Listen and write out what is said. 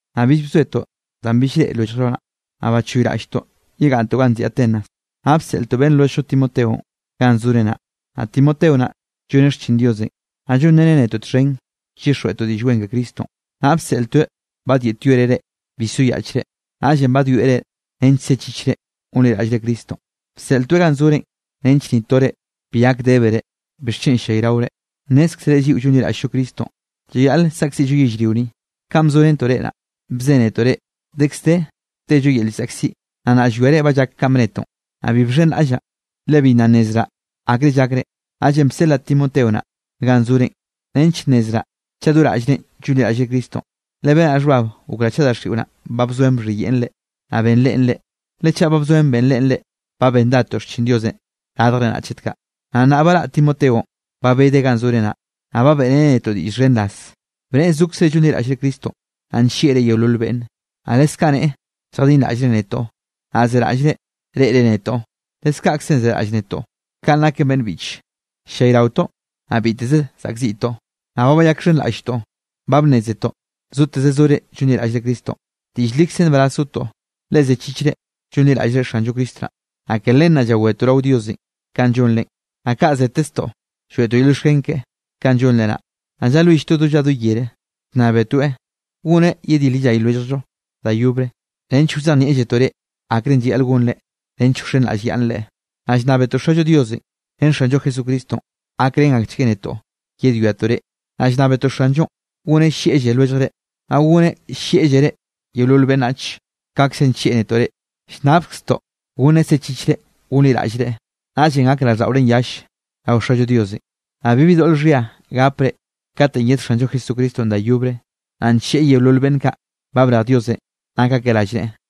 Naꞌ bill bzoetoꞌ danꞌ bill llreꞌe lwelljllo naꞌ. Naꞌ bachoyraꞌlltoꞌ yegaꞌnntoꞌ ganꞌ nziꞌi Atenas. Naꞌ bseꞌltoꞌ beꞌnn lwelljllo Timoteonꞌ ganꞌ zore naꞌ. Naꞌ Timoteo naꞌ lloneꞌ xchin Diosenꞌ, naꞌ llonreneꞌ netoꞌ txhen llyixjweꞌtoꞌ Diꞌll Wen ke Cristonꞌ. Naꞌ bseꞌltoeꞌ badyeꞌtyoereꞌ reꞌ bi soyaꞌchre, naꞌllenꞌ badwieꞌ reꞌ nench sechichre gonliraꞌllre Cristonꞌ. Bseꞌltoeꞌ ganꞌ zorenꞌ nench ni tore bi gak débere bixchen ll-llayraore. Nnézkzere lliꞌo llonliraꞌll-llo Cristonꞌ, llayaꞌle saꞌkziꞌllo yellrio ni. Kanꞌ bzorentoꞌ reꞌ naꞌ, bzénetoꞌ reꞌ, dekz de tello yel llzaꞌkziꞌ, naꞌ nnaꞌ llwiare ba llak kanꞌ bnetoꞌn. Naꞌ bi bxhenraꞌllaꞌ, le bi nna nnezraꞌ akre llakre, naꞌllenꞌ bseꞌlaꞌ Timoteo naꞌ, ganꞌ zorenꞌ nench nnezraꞌ chaꞌ do raꞌllrenꞌ llonliraꞌllre Cristonꞌ. Le benaꞌ xhbab gokraꞌ chaꞌ daxiꞌo naꞌn ba bzoen bxhiyeꞌn reꞌ, naꞌ benreꞌn reꞌ. Le chaꞌ ba bzoen benreꞌn reꞌ, ba bendadtoꞌ xchin Diosenꞌ radjre naꞌ chet kaꞌ. Naꞌ nnaꞌ baraꞌ Timoteonꞌ ba bedeꞌ ganꞌ zore naꞌ, naꞌ ba beꞌreneꞌ netoꞌ diꞌll xhen raz, bneꞌe zokzre llonliraꞌllre Cristonꞌ, naꞌ nllieꞌre yeolol beꞌnne. Naꞌ leskaꞌ neꞌe lljadinraꞌllre netoꞌ, naꞌ zeraꞌllre reꞌre netoꞌ, leskaꞌkzenꞌ zeraꞌll netoꞌ. Kaꞌn naken beꞌnn biꞌche, ll-llayraotoꞌ naꞌ biteze zaꞌkziꞌtoꞌ, naꞌ ba bayakxhenraꞌlltoꞌ, ba bnnézetoꞌ zoteze zore llonliraꞌllre Cristonꞌ. Diꞌll likze nbaraz zotoꞌ, le zechichre llonliraꞌllre Xanllo Cristo naꞌ. Naꞌ ke len naꞌ llawetoꞌ rao Diosenꞌ kanꞌ llonrenꞌ, naꞌ kaꞌ zeteztoꞌ lloeꞌtoꞌ yel llioxken keꞌe kanꞌ llonre naꞌ. Naꞌ llalwilltoeꞌ do lla do yere, llnnábetoeꞌ goneꞌ yedil yellay lwelljllo da yobre, nench wzejnieꞌlletoꞌ reꞌ akrenꞌ llayaꞌl gonre nench wxenraꞌllyaꞌnnre. Naꞌ llnnábetoꞌ Xallo Diosenꞌ ren Xanllo Jesucristonꞌ gakrén akchgueꞌ netoꞌ yedwiatoꞌ reꞌ. Naꞌ llnnábetoꞌ Xanllonꞌ goneꞌ llieꞌlle lwelljre, naꞌ goneꞌ llieꞌllere yeolol beꞌnnach kaꞌkzenꞌ nllieꞌ netoꞌ reꞌ. Llnnabkztoꞌ goneꞌ sechichre gonliraꞌllreꞌ, naꞌllenꞌ gak raꞌlldaꞌorenꞌ yall rao Xallo Diosenꞌ, naꞌ bibi doꞌl xhia gapre katenꞌ yed Xanllo Jesucristonꞌ da yobre, naꞌ ncheꞌe yeolol beꞌnn kaꞌ ba brej Diosenꞌ nak akeꞌ rallneꞌe.